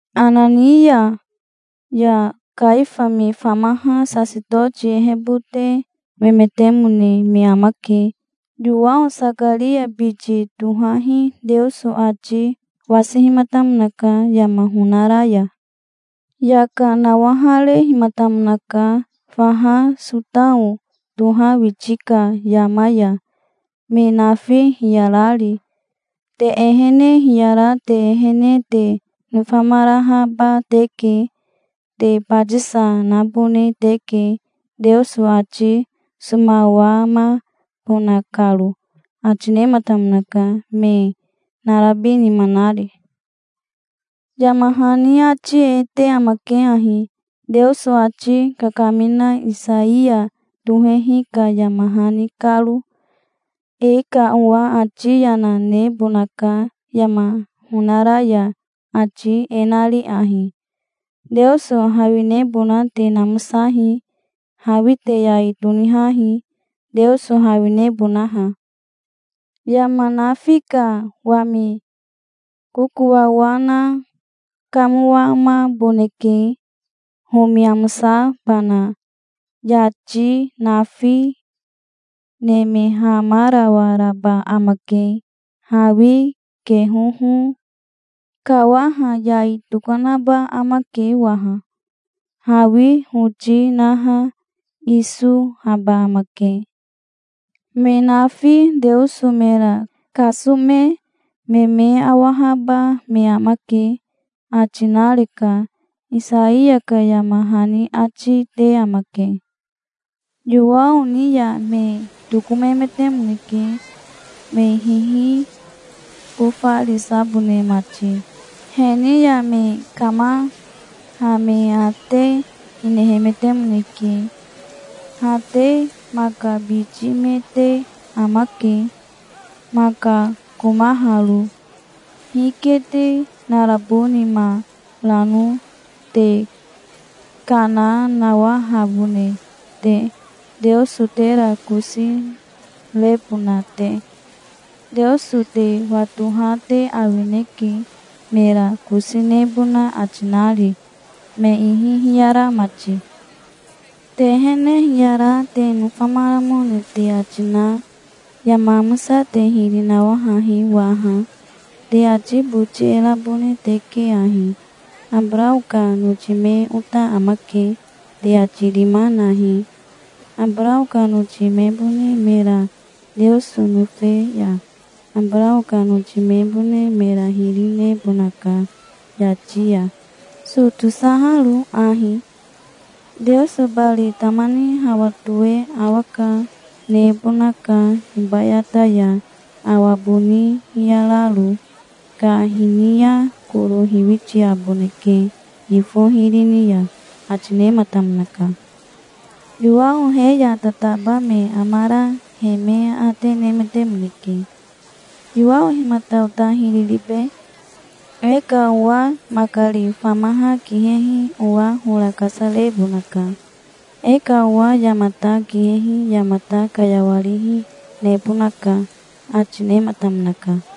Anania ya Kaifa me famaha sasetoti ehebote memetemone me amake. Yowao Sakaria biti tohahi Teoso ati wasihimatamonaka, yama honara ya. Yaka nawaharehimatamonaka faha Sotao toha witi ka yama ya, me nafi hiyarari. "Te ehene hiyara te ehene te nofamarahaba teke. Te batisa, nabone teke, Teoso ati somawamabona karo", ati nematamonaka, me narabi nima nari. Yama hani ati e te amake ahi, Teoso ati kakamina Isaiya tohehi ka yama hani karo: "E ka owa ati yana nebonaka yama honara ya, ati e nari ahi: 'Teoso hawinebona te namosahi. Hawi te yai tonihahi, Teoso hawinebonaha. Yama nafi ka wami kokowawa na kamowamaboneke, homi amosabana. Yati nafi nemehamarawaraba amake. Hawi kehoho kawaha yai tokanaba amake waha. Hawi hoti naha isohaba amake. Me nafi Teoso mera kasome me me awahaba me amake', ati nareka", Isaiya ka yama hani ati te amake. Yowao ni ya me tokomemetemoneke, me hihibofarisabone mati. He ni ya me kamaha me aate hinehemetemoneke. "Ha te maka biti me te amake, maka komaharo. Hike te narabo nima rano, te kana nawahabone te, Teoso tera kosi rebona te? Teoso te watoha te awineke, mera kosi nebona ati nari, me ihi hiyara mati. Te ehene hiyara te nofamaramone te ati na, yama amosa te hiri nawahahi waha. Te ati boti e rabone teke ahi: 'Abarao ka noti me ota amake', te ati rima nahi. Abarao ka noti mebone mera Teoso nofe ya Abarao ka noti mebone mera hiri nebonaka yati ya, so tosaharo ahi. Teoso bari tama ni hawa toe awa ka nebonaka hibayata ya, awa boni hiyararo. Ka hini ya koro hiwitiaboneke yifo hiri ni ya", ati nematamonaka. Yowao he ya tataba me amara he me aate nemetemoneke. "Yowao himata ota hiri ribe?" "E ka owa makari famaha kihehi owa hora kasarebonaka. E ka owa yamata kihehi yamata kayawarihi, nebonaka", ati nematamonaka.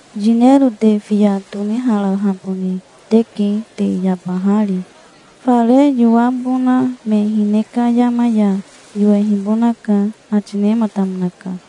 "Yinero te fiya toniharahabone teke te yabahari. Fare yowabona me hine ka yama ya yowehibonaka", ati nematamonaka.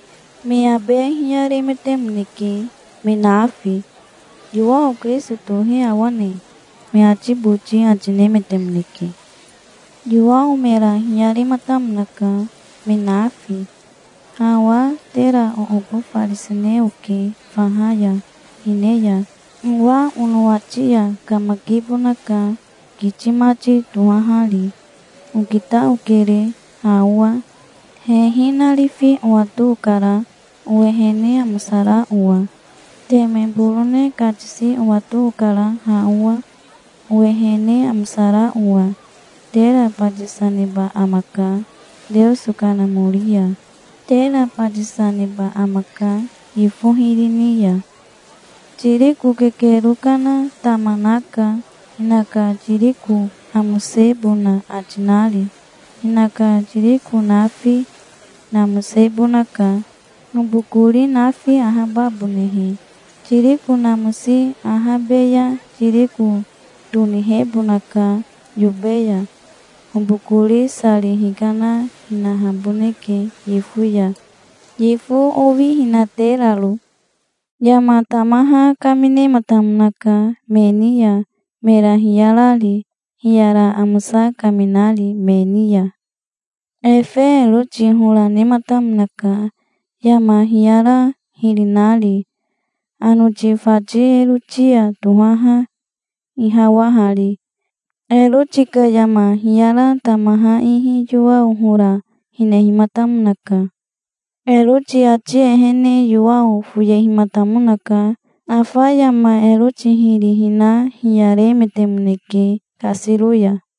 Me abe hiyaremetemoneke, me nafi. "Yowao Kirisito tohe awane?" me ati boti ati nemetemoneke. Yowao mera hiyarematamonaka, me nafi. "Ha owa tera oobofarisine oke faha ya hine ya. Owa onowati ya kamakibonaka, kiti mati tohahari. Okita okere, ha owa. Hehi narifi owato okara, owehene amosara owa. Teme borone katisi owato okara ha owa, owehene amosara owa. Tera batisa neba amaka Teoso Kanamori ya. Tera batisa, neba amaka yifo hiri ni ya. Tiriko kekero kana tama naka, hinaka tiriko namosebona ati nari. Hinaka tiriko nafi namosebonaka, hobokori nafi ahababonehe. Tiriko namosi ahabe ya tiriko tonihebonaka yobe ya. Hobokori sari hikana hinaboneke yifo ya, yifo owihinateraro". Yama tamaha kaminematamonaka me ni ya, mera hiyarari, hiyara amosa kaminari me ni ya. Efe Eroti hora nematamonaka, yama hiyara hiri nari, anoti fati Erotia tohaha ihawahari. Eroti ka yama hiyara tamaha ihi Yowao hora, hinehimatamonaka. Eroti ati ehene Yowao foyehimatamonaka. Afa yama Eroti hiri hina hiyaremetemoneke kasiro ya.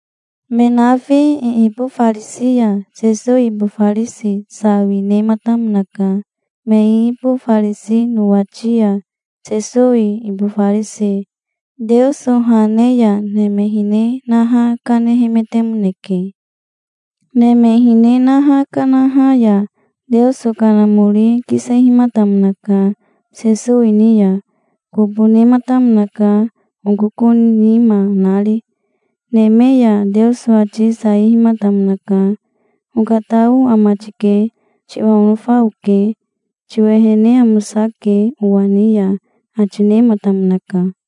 Me nafi iibofarisi ya Sesowi ibofarisi sawi nematamonaka. Me iibofarisi nowati ya Sesowi ibofarise Teoso ha ne ya neme hine naha kanemetemoneke. Neme hine naha kanaha ya Teoso Kanamori kisehimatamonaka Sesowi ni ya. Kobo nematamonaka okoko nima nari. Neme ya Teoso ati saihimatamonaka. "Okatao ama tike. Tiwa onofa oke. Tiwehene amosake owa ni ya", ati nematamonaka.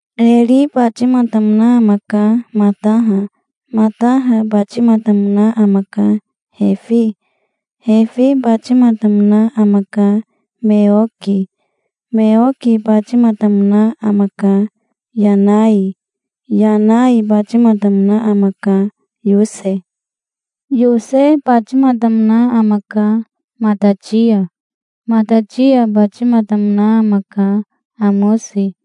Eri batimatamona amaka, Mataha. Mataha batimatamona amaka, Refi. Refi batimatamona amaka, Meoki. Meoki batimatamona amaka, Yanai. Yanai batimatamona amaka, Yose. Yose batimatamona amaka, Matatia. Matatia batimatamona amaka, Amosi.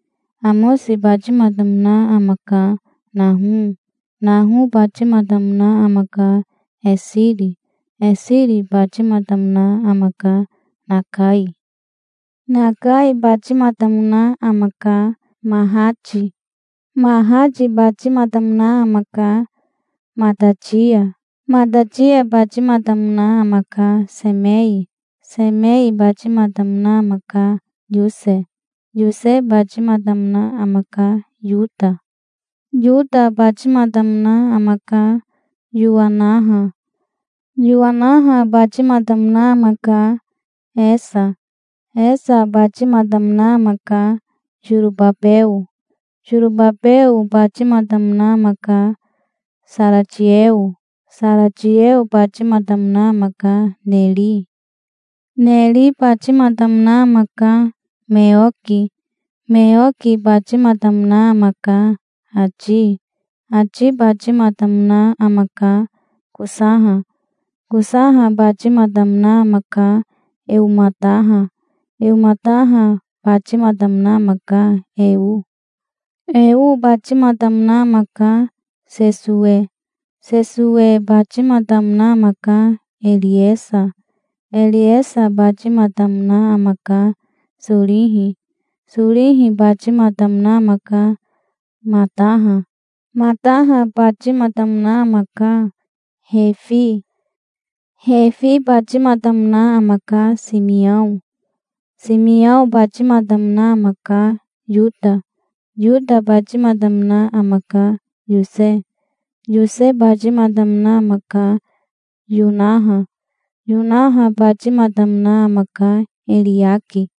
Amosi batimatamona amaka, Naho. Naho batimatamona amaka, Esiri. Esiri batimatamona amaka, Nakai. Nakai batimatamona amaka, Mahati. Mahati batimatamona amaka, Matatia. Matatia batimatamona amaka, Semei. Semei batimatamona amaka, Yose. Yose batimatamona amaka, Yota. Yota batimatamona amaka, Yowanaha. Yowanaha batimatamona amaka, Hesa. Hesa batimatamona amaka, Sorobabeo. Sorobabeo batimatamona amaka, Saratieo. Saratieo batimatamona amaka, Neri. Neri batimatamona amaka, Meoki. Meoki batimatamona amaka, Ati. Ati batimatamona amaka, Kosaha. Kosaha batimatamona amaka, Eomataha. Eomataha batimatamona amaka, Eo. Eo batimatamona amaka, Sesowe. Sesowe batimatamona amaka, Eriesa. Eriesa batimatamona amaka, Sorihi. Sorihi batimatamona amaka, Mataha. Mataha batimatamona amaka, Refi. Refi batimatamona amaka, Simiao. Simiao batimatamona amaka, Yota. Yota batimatamona amaka, Yose. Yose batimatamona amaka, Yonaha. Yonaha batimatamona amaka, Eriaki.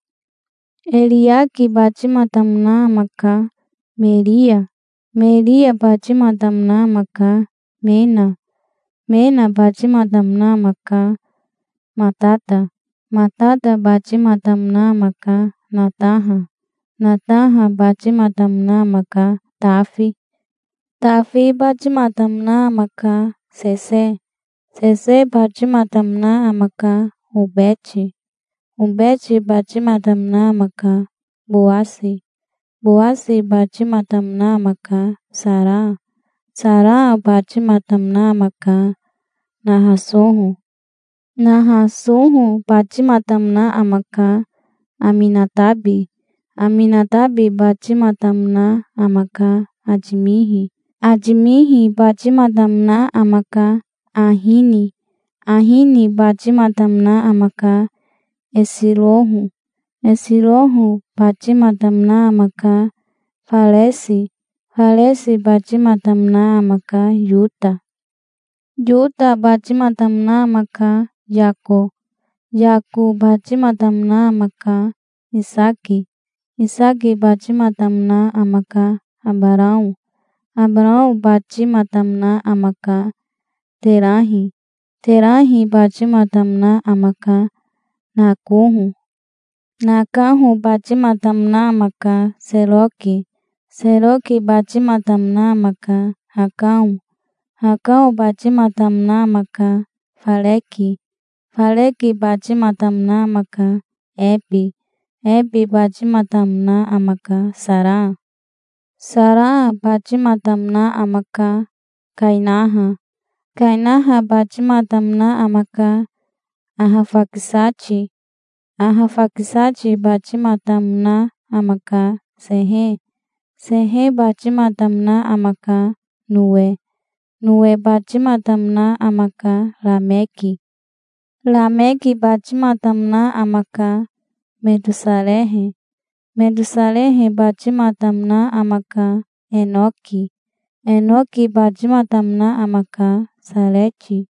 Eriaki batimatamona amaka, Meria. Meria batimatamona amaka, Mena. Mena batimatamona amaka, Matata. Matata batimatamona amaka, Nataha. Nataha batimatamona amaka, Tafi. Tafi batimatamona amaka, Sese. Sese batimatamona amaka, Obeti. Obeti batimatamona amaka, Bowasi. Bowasi batimatamona amaka, Sara. Sara batimatamona amaka, Nahasoho. Nahasoho batimatamona amaka, Aminatabi. Aminatabi batimatamona amaka, Atimihi. Atimihi batimatamona amaka, Ahini. Ahini batimatamona amaka, Esiroho. Esiroho batimatamona amaka, Faresi. Faresi batimatamona amaka, Yota. Yota batimatamona amaka, Yako. Yako batimatamona amaka, Isaki. Isaki batimatamona amaka, Abarao. Abarao batimatamona amaka, Terahi. Terahi batimatamona amaka, Nakoho. Nakoho batimatamona amaka, Seroki. Seroki batimatamona amaka, Hakao. Hakao batimatamona amaka, Fareki. Fareki batimatamona amaka, Ebe. Ebe batimatamona amaka, Sara. Sara batimatamona amaka, Kainaha. Kainaha batimatamona amaka, Ahafakisati. Ahafakisati batimatamona amaka, Sehe. Sehe batimatamona amaka, Nowe. Nowe batimatamona amaka, Rameki. Rameki batimatamona amaka, Metosarehe. Metosarehe batimatamona amaka, Enoki. Enoki batimatamona amaka, Sareti.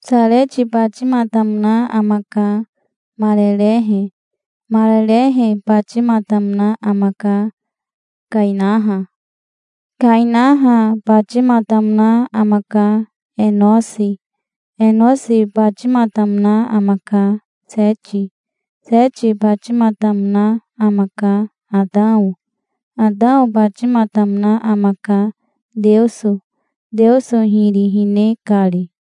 Sareti batimatamona amaka, Marerehe. Marerehe batimatamona amaka, Kainaha. Kainaha batimatamona amaka, Enosi. Enosi batimatamona amaka, Seti. Seti batimatamona amaka, Atao. Atao batimatamona amaka, Teoso, Teoso hiri hine kari.